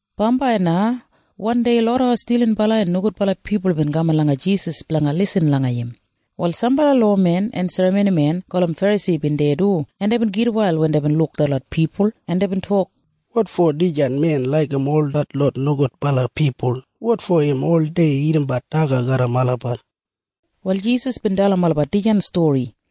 Bambai na wandei loda stilinbala en nogudbala pipul bin kaman langa Jisas blanga lisin langa im. Wal sambala lowamen en serramonimen gulum Ferasi bin deya du, en deibin gitwail wen deibin luk detlot pipul, en deibin tok, “Wotfo dijan men laigim ol detlot nogudbala pipul? Wotfo im oldei dagadagat daga garram olabat?” Wal Jisas bin dalim olabat dijan stori.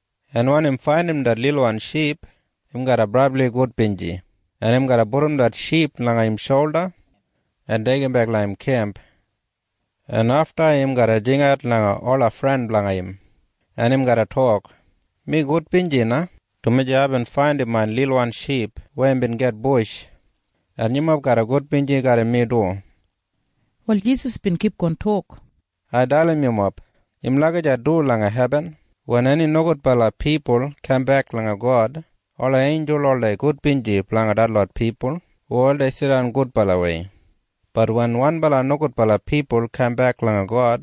en wen im faindim det lilwan ship, im garra brabli gudbinji, en im garra pudum det ship langa im sholda en deigimbek langa im kemp, en afta im garra jingat langa ola fren blanga im, en im garra tok, ‘Mi gudbinji na, dumaji aibin faindim main lilwan ship weya bin gitbush. En yumob garra gudbinji garram mi du.’” Wal Jisas bin kipgon tok, “Ai dalim yumob. Im lagijat du langa hebin wen eni nogudbala pipul kambek langa God. Ola einjul oldei gudbinji blanga detlot pipul hu oldei jidan gudbalawei. Bat wen wanbala nogudbala pipul kambek langa God,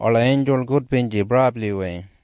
ola einjul gudbinji brabliwei.”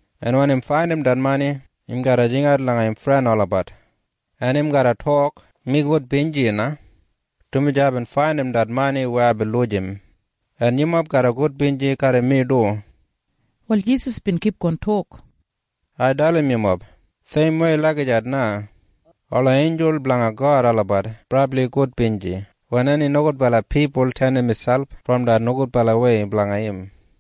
en wen im faindim det mani, im garra jingat langa im fren olabat, en im garra tok, ‘Mi gudbinji na, dumaji aibin faindim det mani weya aibin lujim. En yumob garra gudbinji garram mi du.’” Wal Jisas bin kipgon tok, “Ai dalim yumob. Seimwei lagijat na ola einjul blanga God olabat brabli gudbinji wen eni nogudbala pipul tenim miselp brom det nogudbalawei blanga im.”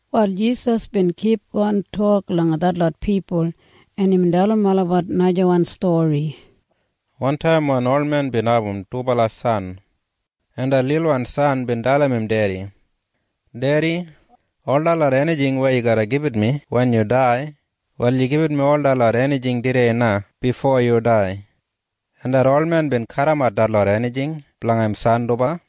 Wal Jisas bin kipgon tok langa detlot pipul, en imbin dalim olabat najawan stori, “Wantaim wan olmen bin abum dubala san, en det lilwan san bin dalim im dedi, ‘Dedi, ol detlot enijing weya yu garra gibit mi wen yu dai, wal yu gibit mi ol detlot enijing tudei na bifo yu dai.’ En det olmen bin kadimat detlot enijing blanga im san dubala.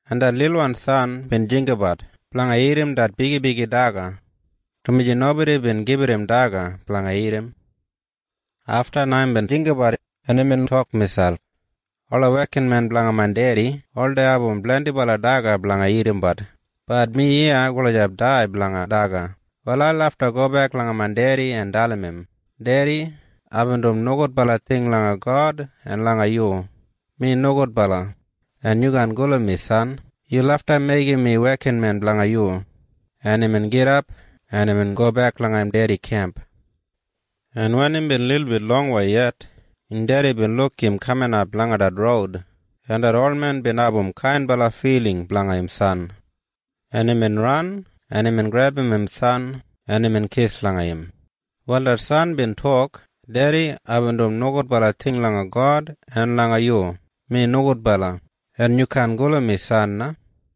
en det lilwan san bin jinggabat blanga dagat det bigibigi daga, dumaji nobodi bin gibit im daga blanga dagat. “Afta na imbin jinggabat, en imbin tok miselp, ‘Ola wekinmen blanga main dedi oldei abum blendibala daga blanga dagadagat. Bat mi iya gulijap dai blanga daga. Wal ai lafta gobek langa main dedi en dalim im, “Dedi, aibin dum nogudbala ting langa God en langa yu. Mi nomo gudbala. Mi nogudbala. En yu kaan gulum mi san. Yu lafta meigim mi wekinmen blanga yu.” ’ “Brom deya det lilwan san bin gidap, en imbin gobek langa im dedi kemp, en wen imbin lilbit longwei yet, im dedi bin luk im kaminap langa det roud, en det olmen bin abum kainbala filing blanga im san, en imbin ran, en imbin grebum im san, en imbin kis langa im. “Wal det san bin tok, ‘Dedi, aibin dum nogudbala ting langa God en langa yu. Mi nomo gudbala. Mi nogudbala. En yu kaan gulum mi san na.’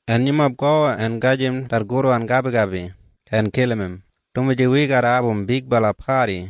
en yumob go en gajim det gudwan gabigabi en kilim im, dumaji wi garra abum bigbala padi.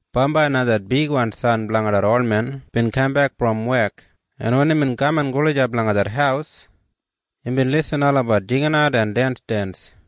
“Bambai na det bigwan san blanga det olmen bin kambek brom wek, en wen imbin kaman gulijap langa det haus, imbin lisin olabat jinginat en densdens.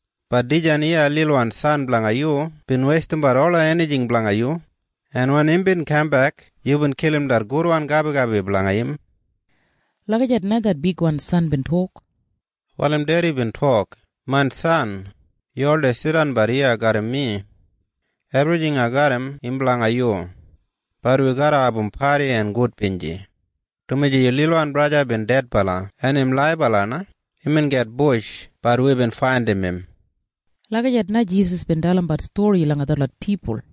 Bat dijan iya lilwan san blanga yu bin weistimbat ola enijing blanga yu langa ola nogudbala yanggel. En wen imbin kambek, yubin kilim det gudwan gabigabi blanga im.’ Lagijat na det bigwan san bin tok. “Wal im dedi bin tok, ‘Main san, yu oldei jidanbat iya garram mi. Ebrijing ai garram, im blanga yu. Bat wi garra abum padi en gudbinji, dumaji yu lilwan braja bin dedbala. Bat im laibala na. Imbin gitbush. Bat wibin faindim im.’” Lagijat na Jisas bin dalimbat stori langa detlot pipul.